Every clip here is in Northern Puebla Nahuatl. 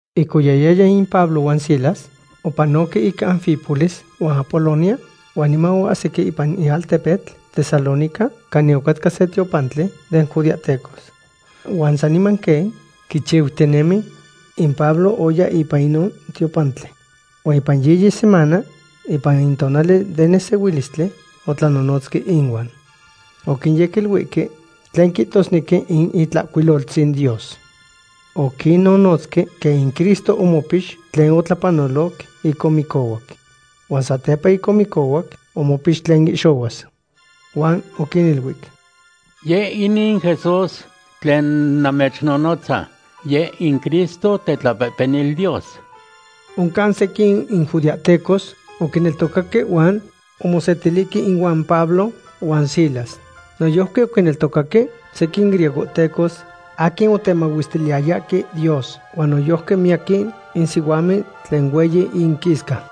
Ic oyahyaya in Pablo huan Silas, opanoque ic Anfípolis huan Apolonia huan niman oahsique ipan in altepetl Tesalónica canin ocatca se tiopantli den judeahtecos. Huan saniman quen quichiutinemi, in Pablo oya ipan inon tiopantli. Huan ipan yiyi semana, ipan in tonali den nesehuilistli, otlanonotzque inuan. Oquinyequiluihque tlen quihtosnequi in Itlahcuiloltzin Dios. Oquinnonotzque quen in Cristo omopix tlen otlapanoloc ic omicohuac. Huan satepa ic omicohuac omopix tlen oihxohuac. Huan oquiniluic: ―Yeh inin Jesús tlen namechnonotza, yeh in Cristo, tetlapehpenil Dios. Oncan sequin in judeahtecos oquineltocaque huan omosetilihque inuan Pablo huan Silas. Noyojqui oquineltocaque sequin griegohtecos aquin otemahuestiliyayahque Dios, huan noyojqui miyaquin in sihuamen tlen hueyi inquisca.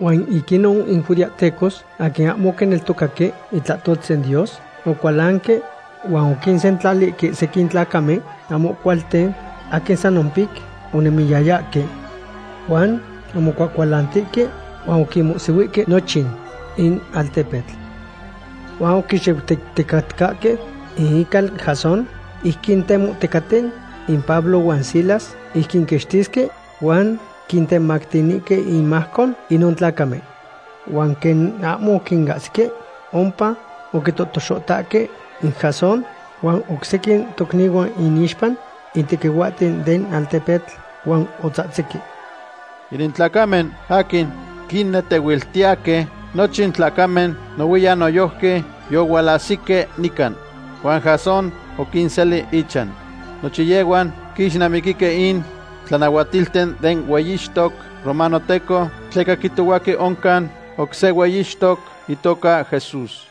Huan ic inon in judeahtecos aquin ahmo oquineltocaque itlahtoltzin Dios ohualcualanque huan oquinsentlalihque sequin tlacamen ahmo cualten aquin san ompic onemiyayahque. Huan omocuahcualantihque huan oquinmohsihuihque nochin in altepetl. Huan oquixuitecticatcahque in ical Jasón ic quintemohticaten in Pablo huan Silas ic quinquixtisque huan quintemactinihque inmajco inon tlacamen. Huan quen ahmo oquinahsihque ompa, oquitotoxohtahque in Jasón huan oc sequin tocnihuan inixpa in tequihuahten den altepetl huan otzahtzihque: ―Inin tlacamen aquin quinnetehuiltiyahque nochin tlacamen nohuiyan noyojqui yohualahsihque nican. Huan Jasón oquinseli ichan. Nochin yehhuan quixnamiquihque in tlanahuatilten den hueyixtoc romanohteco, tleca quihtohuahque oncan oc se hueyixtoc itoca Jesús.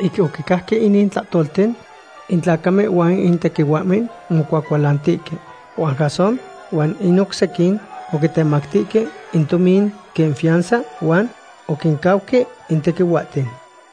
Ic oquicajque inin tlahtolten, in tlacamen huan in tequihuahmen omocuacualantihque. Huan Jasón huan in oc sequin oquitemactihque in tomin quen fianza huan oquincauque in tequihuahten.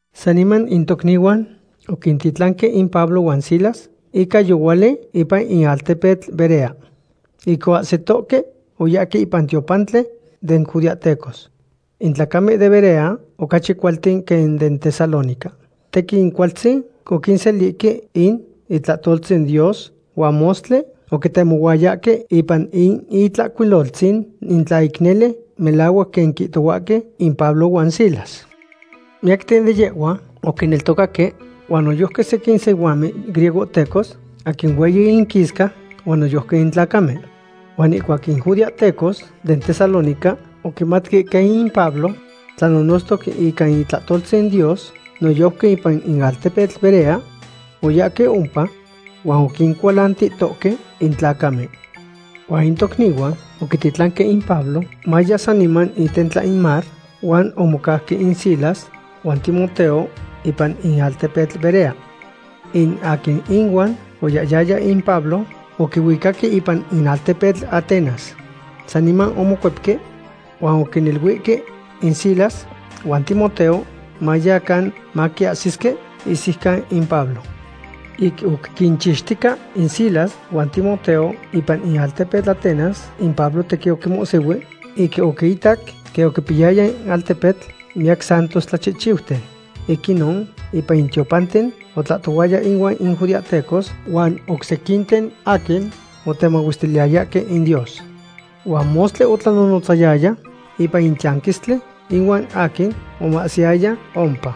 Saniman in tocnihuan oquintitlanque in Pablo huan Silas ica yohuali ipan in altepetl Berea. Ic oahsitohque, oyahque ipan in tiopantli den judeahtecos. In tlacamen den Berea ocachi cualten quen den Tesalónica. Tequin cualtzin oquiselihque in itlahtoltzin Dios huan mostli oquitemohuayahque ipan in Itlahcuiloltzin in tla ic nele melahuac quen quihtohuahque in Pablo huan Silas. Miyacten de yehhuan oquineltocaque, huan noyojqui sequin sihuamen griegohtecos, aquin hueyi inquisca, huan noyojqui in tlacamen. Huan ihcuac in judeahtecos den Tesalónica oquimatque quen in Pablo tlanonotztoc ica itlahtoltzin Dios noyojqui ipan in altepetl Berea, oyahque ompa huan oquincualantihtohque in tlacamen. Huan in tocnihuan oquititlanque in Pablo mayau saniman itentla in mar, huan omocauque in Silas huan Timoteo ipan in altepetl Berea. In aquin ihuan oyahyaya in Pablo oquihuicaque ipan in altepetl Atenas. Saniman omocuepque huan oquiniluihque in Silas huan Timoteo mayacan maquiahsisque ihsiucan in Pablo. Ic oc quinchixtica in Silas huan Timoteo ipan in altepetl Atenas, in Pablo tequin omomohsihui ic oquiitac quen oquipiyaya in altepetl miyac santos tlachihchiuten. Ic inon, ipan in tiopanten otlahtohuaya inuan in judeahtecos huan oc sequinten aquin otemahuestiliyayahque in Dios. Huan mostli otlanonotzayaya ipan in tiyanquistli ihuan aquin omahsiyaya ompa.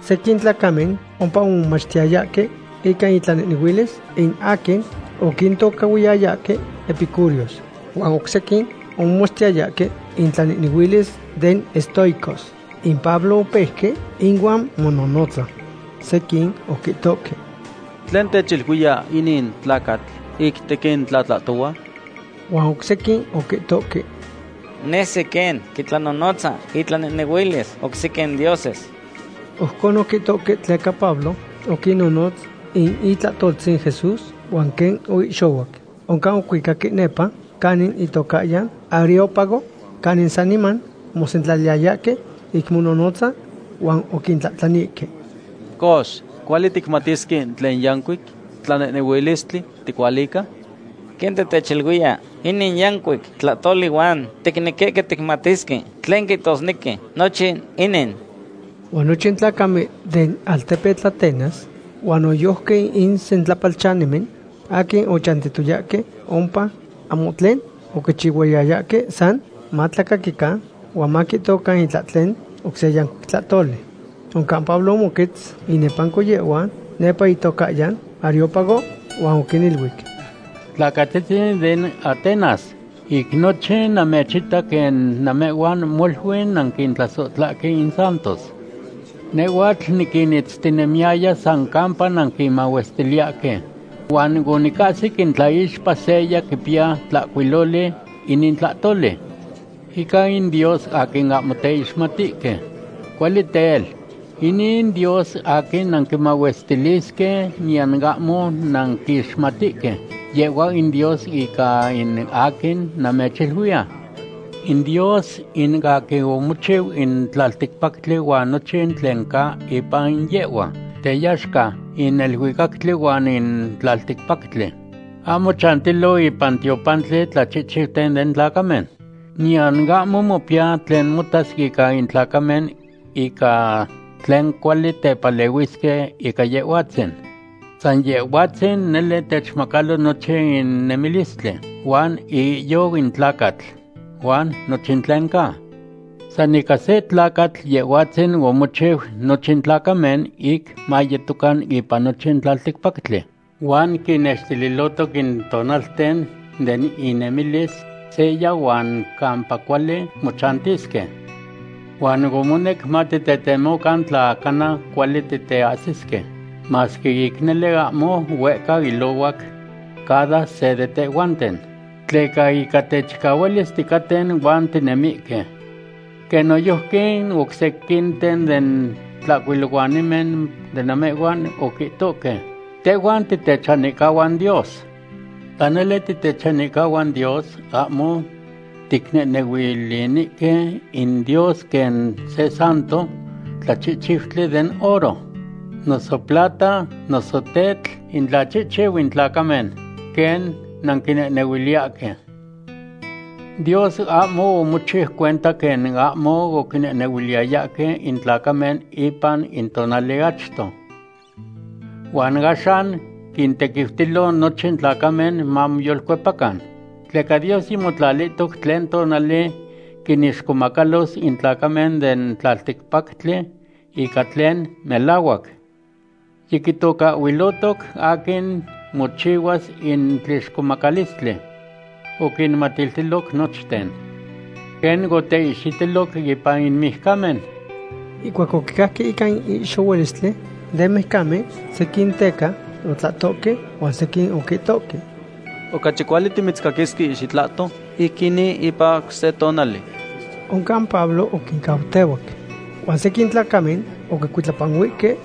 Sequin tlacamen ompa omomachtiyayahque ica intlanehnehuilis in aquin oquintocahhuiyayahque epicureos. Huan oc sequin omomachtiyayahque intlanehnehuilis den estoicos. In Pablo opeuque ihuan omonohnotza. Sequin oquihtohque: ―¿Tlen techiluiya inin tlacatl ic tequin tlatlahtohua? Huan oc sequin oquihtohque: ―Nesi quen quitlanonotza itlanehnehuilis oc sequin dioses. Ojcon oquihtohque tleca Pablo oquinnonotz in itlahtoltzin Jesús huan quen oihxohuac. Oncan ocuicaque nepa canin itocahyan Areópago, canin saniman omosentlaliyahque ic mononotza, huan oquitlahtlanihque: ―Cox, ¿cuali ticmatisque in tlen yancuic tlanehnehuilistli ticualica? Quen titechiluiya inin yancuic tlahtoli huan ticnequihque ticmatisque tlen quihtosnequi nochin inin. Huan nochin tlacamen den altepetl Atenas huan noyojqui in sentlapalchanimen aquin ochantiyayahque ompa, ahmo tlen oquichihuayayahque san matlacaquican huan maquihtocan itlahtlen oc se yancuic tlahtoli. Oncan Pablo omoquetz inepanco yehhuan nepa itocahyan Areópago huan oquiniluic: ―Tlacatzitzin den Atenas, ic nochin namechita quen namehhuan molui nanquintlasohtlahque in santos. Nehhuatl niquinitztinemiyaya san campa nanquimahuestiliyahque. Huan onicahsic in tlaixpa seya quipiya tlahcuiloli inin tlahtoli: “Ica in dios aquin ahmo teixmatihque.” Cuali tel, inin dios aquin nanquimahuestilisque niyan ahmo nanquixmatihque, yehhua in Dios ica in aquin namechiluiya. ’In Dios in aquin omochiu in tlalticpactli huan nochin tlen ca ipan yehhua, teyaxca in neluicactli huan in tlalticpactli. Ahmo chantilo ipan tiopantli tlachihchiuten den tlacamen. Niyan ahmo mopiya tlen motas ica in tlacamen ica tlen cuali tepalehuisque ica Yehhuatzin. San Yehhuatzin nele techmacalo nochin in nemilistli, huan iihyou in tlacatl, huan nochin tlen ca. ’San ica se tlacatl Yehhuatzin omochiu nochin tlacamen ic mayetocan ipan nochin tlalticpactli. Huan quinextililohtoc in tonalten de inemilis seya huan campa cuali mochantisque. Huan omonec matitetemocan, tla cana cuali titeahsisque, masque ic nele ahmo huehca ilohuac cada se de tehhuanten. Tleca ica techicahualis ticaten huan tinemihque. Quen noyojqui oc sequinten den tlahcuilohuanimen de namehhuan oquihtohque: “Tehhuan titechanihcahuan Dios.” Tla nele titechanihcahuan Dios, ahmo ticnehnehuilinihque in Dios quen se santo tlachihchiutli den oro, noso plata, noso tetl, intlachihchiu in tlacamen, quen nanquinehnehuiliyahque. Dios ahmo omochiu cuenta quen ahmo oquinehnehuiliyayahque in tlacamen ipan in tonali achto. Huan axan quintequiutilo nochin tlacamen mamoyolcuepacan. Tleca Dios yimotlalihtoc tlen tonali quinixcomacalos in tlacamen den tlalticpactli ica tlen melahuac. Yiquitocahhuilohtoc aquin mochihuas in tlixcomacalistli. Oquinmatiltiloc nochten, quen oteihxitiloc ipan in mijcamen. Ihcuac oquicajque ica in ihxohualistli den mijcamen, sequin teca otlahtohque, huan sequin oquihtohque: ―Ocachi cuali timitzcaquisque xitlahto ic inin ipan oc se tonali. Oncan Pablo oquincautehuac. Huan sequin tlacamen oquicuitlapanuihque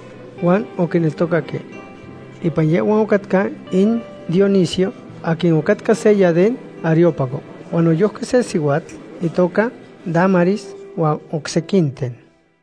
huan oquineltocaque. Ipan yehhuan ocatca in Dionisio aquin ocatca seya den Areópago, huan noyojqui se sihuatl itoca Dámaris, huan oc sequinten.